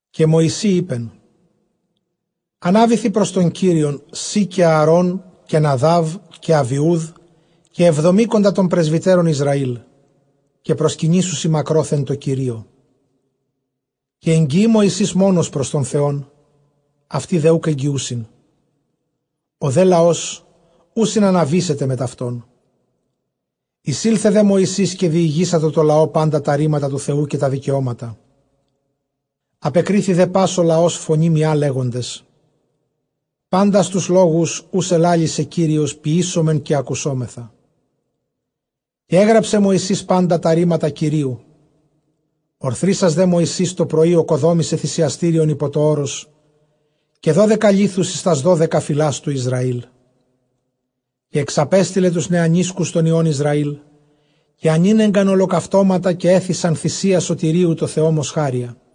Καὶ Μωυσῇ εἶπεν, ἀνάβηθι πρὸς τὸν Κύριον σὺ καὶ Ἀαρὼν, καὶ Ναδὰβ, καὶ Ἀβιοὺδ, καὶ ἑβδομήκοντα τῶν πρεσβυτέρων Ἰσραήλ· καὶ προσκυνήσουσι μακρόθεν τῷ Κυρίῳ. Καὶ ἐγγιεῖ Μωσῆς μόνος πρὸς τὸν Θεὸν, αὐτοὶ δὲ οὐκ ἐγγιοῦσιν, ὁ δὲ λαὸς οὐ συναναβήσεται μετʼ αὐτῶν. Εἰσῆλθε δὲ Μωυσῆς, καὶ διηγήσατο τῷ λαῷ πάντα τὰ ῥήματα τοῦ Θεοῦ καὶ τὰ δικαιώματα· ἀπεκρίθη δὲ πᾶς ὁ λαὸς φωνῇ μιᾷ, λέγοντες, πάντας τοὺς λόγους, οὓς ἐλάλησε Κύριος, ποιήσομεν, καὶ ἀκουσόμεθα. Καὶ ἔγραψε Μωυσῆς πάντα τὰ ῥήματα Κυρίου· ὀρθρίσας δὲ Μωυσῆς τὸ πρωῒ ᾠκοδόμησε θυσιαστήριον ὑπὸ τὸ ὄρος, καὶ δώδεκα λίθους εἰς τὰς δώδεκα φυλὰς τοῦ Ἰσραήλ. Καὶ ἐξαπέστειλε τοὺς νεανίσκους τῶν υἱῶν Ἰσραήλ, καὶ ἀνήνεγκαν ὁλοκαυτώματα· καὶ ἔθυσαν θυσίαν σωτηρίου τῷ Θεῷ μοσχάρια.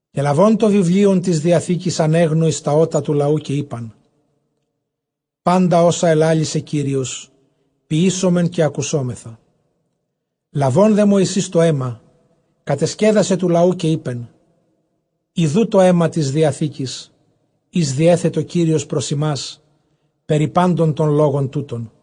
Καὶ λαβὼν τὸ βιβλίον τῆς διαθήκης, ἀνέγνω εἰς τὰ ὦτα τοῦ λαοῦ· καὶ εἶπαν, πάντα ὅσα ἐλάλησε Κύριος, ποιήσομεν καὶ ἀκουσόμεθα. Λαβὼν δὲ Μωυσῆς τὸ αἷμα, κατεσκέδασε τοῦ λαοῦ, καὶ εἶπεν, ἰδοὺ τὸ αἷμα τῆς διαθήκης, ἧς διέθετο Κύριος πρὸς ὑμᾶς περὶ πάντων τῶν λόγων τούτων.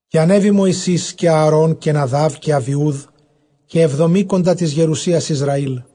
Καὶ ἀνέβη Μωυσῆς καὶ Ἀαρὼν, καὶ Ναδὰβ, καὶ Ἀβιοῦδ, καὶ ἑβδομήκοντα τῆς γερουσίας Ἰσραήλ.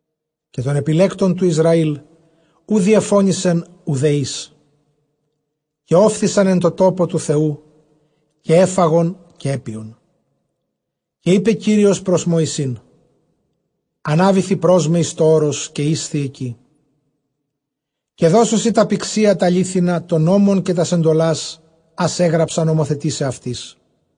Καὶ τῶν ἐπιλέκτων τοῦ Ἰσραὴλ οὐ διεφώνησεν οὐδὲ εἷς· καὶ ὤφθησαν ἐν τῷ τόπῳ τοῦ Θεοῦ, καὶ ἔφαγον καὶ ἔπιον. Καὶ εἶπε Κύριος πρὸς Μωυσῆν, ἀνάβηθι πρὸς με εἰς τὸ ὄρος, καὶ ἴσθι ἐκεῖ· καὶ δώσω σοι τὰ πυξία τὰ λίθινα, τὸν νόμον καὶ τὰς ἐντολας, ἃς ἔγραψα νομοθετῆσαι αὐτοῖς.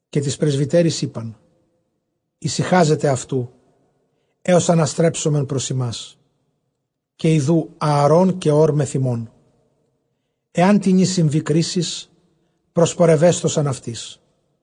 Καὶ τοῖς πρεσβυτέροις εἶπαν, ἡσυχάζετε αὐτοῦ, ἕως ἀναστρέψωμεν πρὸς ὑμᾶς· καὶ ἰδοὺ Ἀαρὼν καὶ Ὢρ μεθʼ ὑμῶν· ἐάν τινι συμβῇ κρίσις, προσπορευέσθωσαν αὐτοῖς.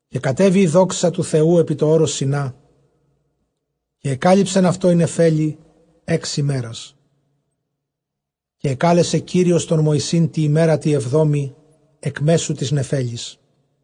Καὶ κατέβη ἡ δόξα τοῦ Θεοῦ ἐπὶ τὸ ὄρος τὸ Σινὰ, καὶ ἐκάλυψεν αὐτὸ ἡ νεφέλη ἓξ ἡμέρας· καὶ ἐκάλεσε Κύριος τὸν Μωυσῆν τῇ ἡμέρᾳ τῇ ἑβδόμῃ ἐκ μέσου τῆς νεφέλης.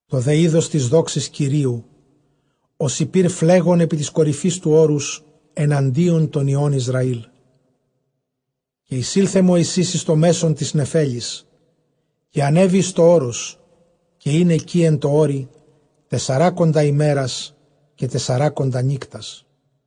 Τὸ δὲ εἶδος τῆς δόξης Κυρίου, ὡσεὶ πῦρ φλέγον ἐπὶ τῆς κορυφῆς τοῦ ὄρους, ἐναντίον τῶν υἱῶν Ἰσραήλ. Καὶ εἰσῆλθε Μωυσῆς εἰς τὸ μέσον τῆς νεφέλης, καὶ ἀνέβη εἰς τὸ ὄρος· καὶ ἦν ἐκεῖ ἐν τῷ ὄρει τεσσεράκοντα ἡμέρας καὶ τεσσαράκοντα νύκτας.